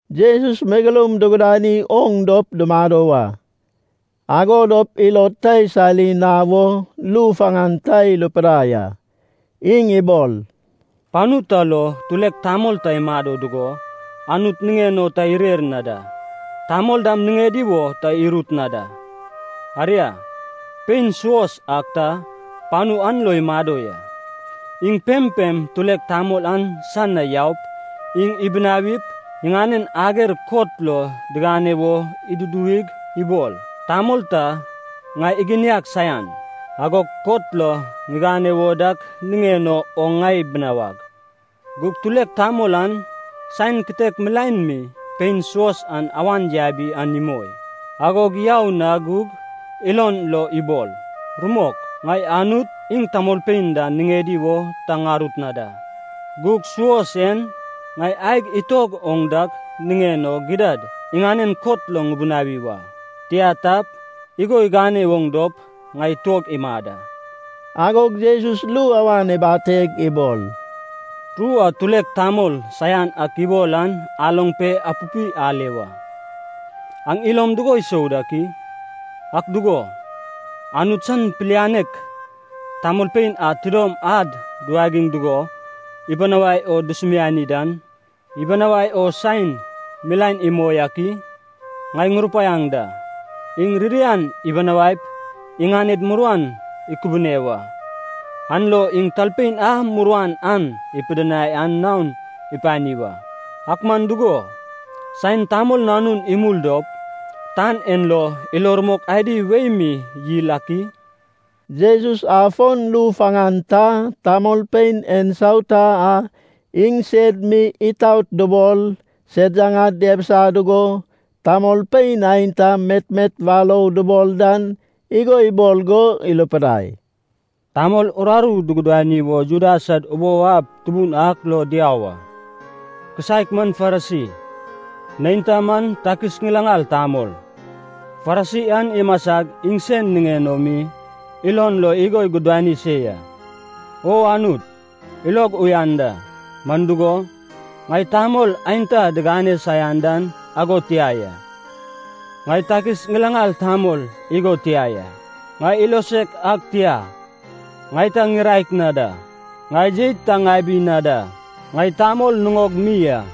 Jesus megeloum dugudani oŋ dop dumado wa, ago dop ilod ta isali na wo ru faŋan ta irupidai a. Iŋ ibol, “Panu ta lo tulek tamol ta imado dugo Anut niŋen o ta irer na da. Tamol dam niŋedi wo ta irut na da. Aria, pein suos ak ta panu an lo imado ya. Iŋ pempem tulek tamol an san na yaup, iŋ ibinawip, iŋanen ager kot lo digane wo iduduwig, ibol: ‘Tamol ta ŋai iginiag saian. Agog kot lo ŋigane wo dak niŋen o oŋ ŋai binawag.’ “Gug tulek tamol an saen kitek milaen mi pein suos an awan yabi an imoi. Agog yau na gug ilon lo ibol, ‘Rumok, ŋai Anut, iŋ tamolpein dam niŋedi wo ta ŋarut na da. Gug suos en ŋai aeg itog oŋ dak niŋen o gidad iŋanen kot lo ŋubinawi wa. Tia tap, igo igane oŋ dop, ŋai tuog imad a.’” Agog Jesus ru awan ibateg ibol, “Ru a tulek tamol saian ak ibol an aloŋ pe apupi ale wa. Aŋ ilom dugo isou dak i? Ak dugo, Anut san pilianek tamolpein a tidom ad duwagiŋ dugo ibinawai o dusumiani dan, ibinawai o saen milaen imoi ak i? Ŋai ŋurupaiaŋ da. Iŋ ririan ibinawaip iŋaned muruan ikubune wa. An lo iŋ talpein a muruan an ipidinai an naon ipani wa. Ak man dugo, saen Tamol Nanun imul dop, tan en lo ilo rumok adi wei mi yil ak i?” Jesus afon ru faŋan ta, tamolpein ensauta a iŋsed mi itaot dubol, sed yaŋad diabisa dugo tamolpein aenta metmet warou dubol dan igo ibol go irupidai, “Tamol uraru dugudani wo Juda sad ubou ab tubun ak lo diau a. Kisaek man Farisi. Neinta man takis ŋilaŋal tamol. Farisi an imasag iŋsen niŋen o mi ilon lo igo igudani se ya, ‘O Anut, ilog uyan da. Man dugo, ŋai tamol aenta digane saian dan ago tia ya. Ŋai takis ŋilaŋal tamol igo tia ya. Ŋai ilosek ag tia. Ŋai ta ŋiraek na da. Ŋai jeit ta ŋabi na da. Ŋai tamol nuŋog mi a.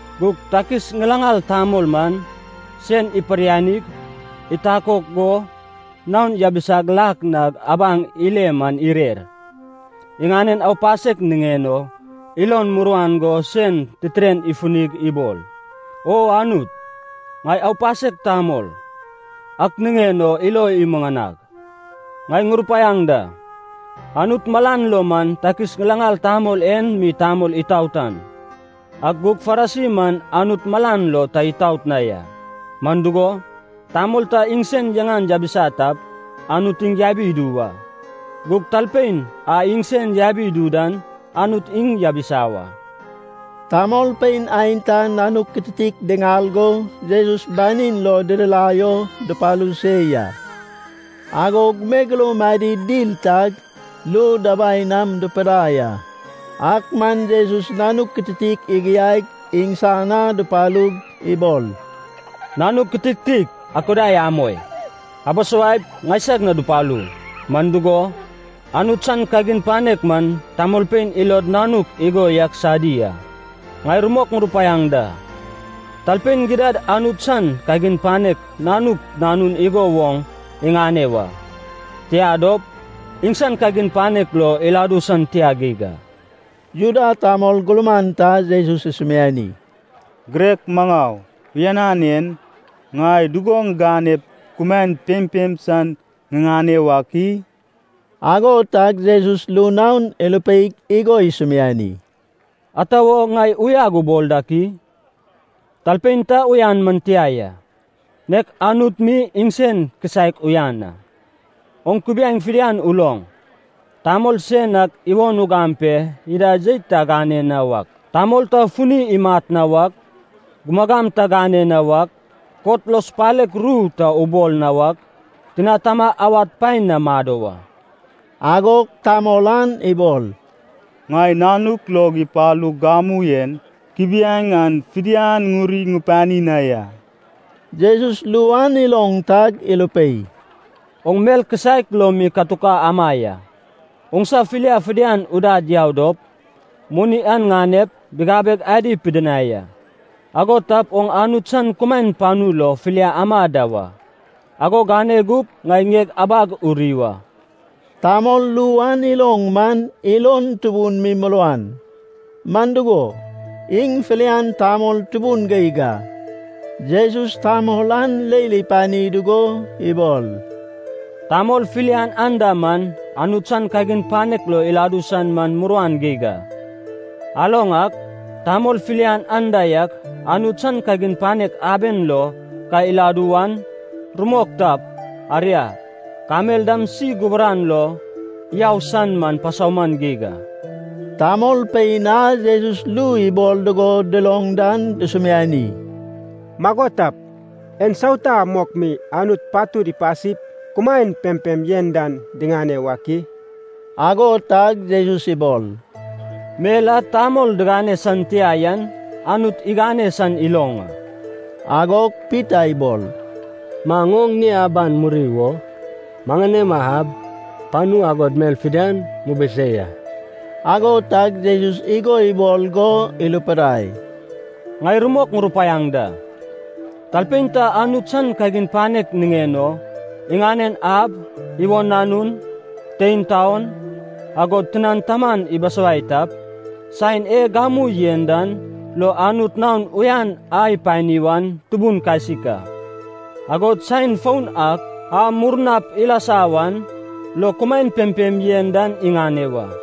“Gug takis ŋilaŋal tamol man, sen iparyanig, itakok go naon yabisag lak na abaŋ ile man irer. Iŋanen aupasek niŋen o ilon muruan go sen titiren ifunig ibol, ‘O Anut, ŋai aupasek tamol. Ak niŋen o ilo imuŋanag.’” “Ŋai ŋurupaiaŋ da. Anut malan lo man takis ŋilaŋal tamol en mi tamol itaot an. Ak gug Farisi man Anut malan lo ta itaot na ya. Man dugo, tamol ta iŋsen yaŋan yabisa tap, Anut iŋ yabi idu wa. Gug talpein a iŋsen yabi idu dan, Anut iŋ yabisa wa.” Tamolpein aenta nanuk kitiktik diŋal go Jesus banin lo didirai o dupalu se ya. Agog megeloum adi dil tag ru dabai nam dupudai a. Ak man Jesus nanuk kitiktik igiaig, iŋsan na dupalug ibol, “Nanuk kitiktik akudai amoi. Abisawaip, ŋaisag na dupalu. Man dugo, Anut san kagin panek man tamolpein ilod nanuk igo yak sadi a. Ŋai rumok ŋurupaiaŋ da. Talpein gidad Anut san kagin panek nanuk nanun igo woŋ iŋane wa. Tia dop, iŋsan kagin panek lo iladu san tia geig a.” Juda tamol gurman ta Jesus isumiani, “Girek maŋau uyanan en. Ŋai dugo ŋiganep kumaen pempem san ŋiŋane wak i?” Ago tag Jesus ru naon irupeig igo isumiani, “Ata wo ŋai uyag ubol dak i? Talpein ta uyan man tia ya, nek Anut mi iŋsen kisaek uyan a. Oŋ kubiaeŋ fidian uloŋ: tamol sen ak iwon ugam pe ida jeit ta agane na wak, tamol ta funi imat na wak, gumagam ta gane na wak, kot lo supalek ru ta ubol na wak, tina tama awad paen na mado wa.” Agog tamol an ibol, “Ŋai nanuk log ipalug gamu en, kubiaeŋ an fidian ŋuri ŋupani na ya.” Jesus ru an iloŋ tag irupei, “Oŋ mel kisaek lo mi katuk ama ya. Oŋsa filia fidian udad yau dop, moni an ŋanep, bigabeg adi pidinai a. Ago tap oŋ Anut san kumaen panu lo filia ama da wa. Ago gane gup, ŋai ŋieg abag uri wa.” Tamol ru an iloŋ man ilon tubun mi muruan. Man dugo, iŋ filian tamol tubun geig a. Jesus tamol an leil ipani dugo ibol, “Tamol filian anda man Anut san kagin panek lo iladu san man muruan geig a. Aloŋ ak, tamol filian anda yak Anut san kagin panek aben lo ka iladu wan, rumok tap, aria, kamel dam si gubaran lo yau san man pasauman geig a.” Tamolpein a Jesus ru ibol dugo duloŋ dan dusumiani, “Mago tap, ensauta mok mi Anut patud ipasip, kumaen pempem yen dan diŋane wak i?” Ago tag Jesus ibol, “Mel a tamol digane san tia yan, Anut igane san iloŋ a.” Agog Pita ibol, “Maŋ oŋ ŋie aban muri wo maŋanema ab, panu agod mel fidian mubusei a.” Ago tag Jesus igo ibol go irupidai, “Ŋai rumok ŋurupaiaŋ da. Talpein ta Anut san kagin panek niŋen o iŋanen ab, iwon nanun, tein taon, agod tinan taman ibisawai tap, saen e gamu yen dan lo Anut naon uyan a ipani wan tubun kasik a. Agod saen foun ak a murnap ilasa wan lo kumaen pempem yen dan iŋane wa.”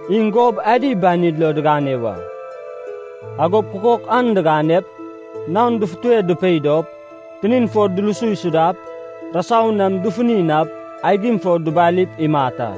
Iŋ gob adi banid lo digane wa. Agop kukok an diganep, naon dufute dupei dop, tinin fo dulusu isudap, rasau nam dufuni nap, aigim fo dubalip imat a.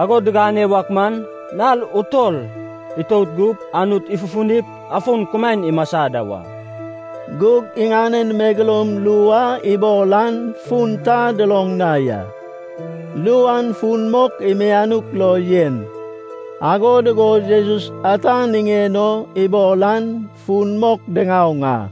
Ago digane wak man, nal utol itout gup, Anut ifufunip afon kumaen imasa da wa.” Gug iŋanen megeloum ru a ibol an fun ta duloŋ na ya. Ru an fun mok mianuk lo yen. Ago dugo Jesus ata niŋen o ibol an fun mok diŋaoŋ a.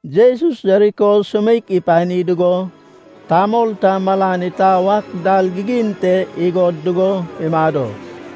Jesus Jeriko sumeik ipani dugo, tamol ta malan itau ak dal gigin te igod dugo imado.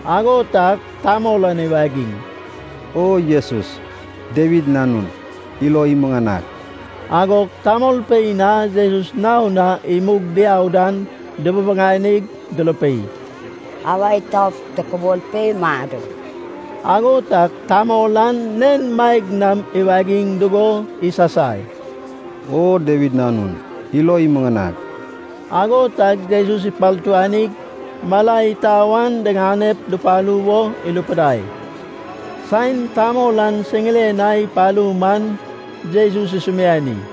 Ago tag tamol an iwagiŋ, “O Jesus, Dawid Nanun, ilo imuŋanag!” Agog tamolpein a Jesus naon na imug diau dan dububuŋanig durupei, “Awa itaup tokubol pe mado!” Ago tag tamol an nen maeg nam iwagiŋ dugo isasai, “O Dawid Nanun, ilo imuŋanag!” Ago tag Jesus ipartuanig mala itau an diŋane dupalu wo irupidai. Saen tamol an siŋiren na ipalu man, Jesus isumiani,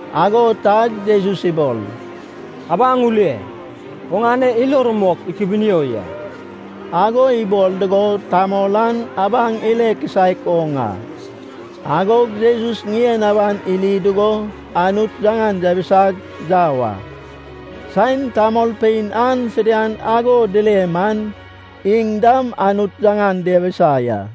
Ago tag Jesus ibol, “Abaŋ ule. Oŋane ilo rumok ikubunio ya.” Ago ibol dugo tamol an abaŋ ile kisaek oŋ a. Agog Jesus ŋien aban iri dugo Anut yaŋan yabisag yau a. Saen tamolpein an fidian ago dile man, iŋ dam Anut yaŋan diabisa ya.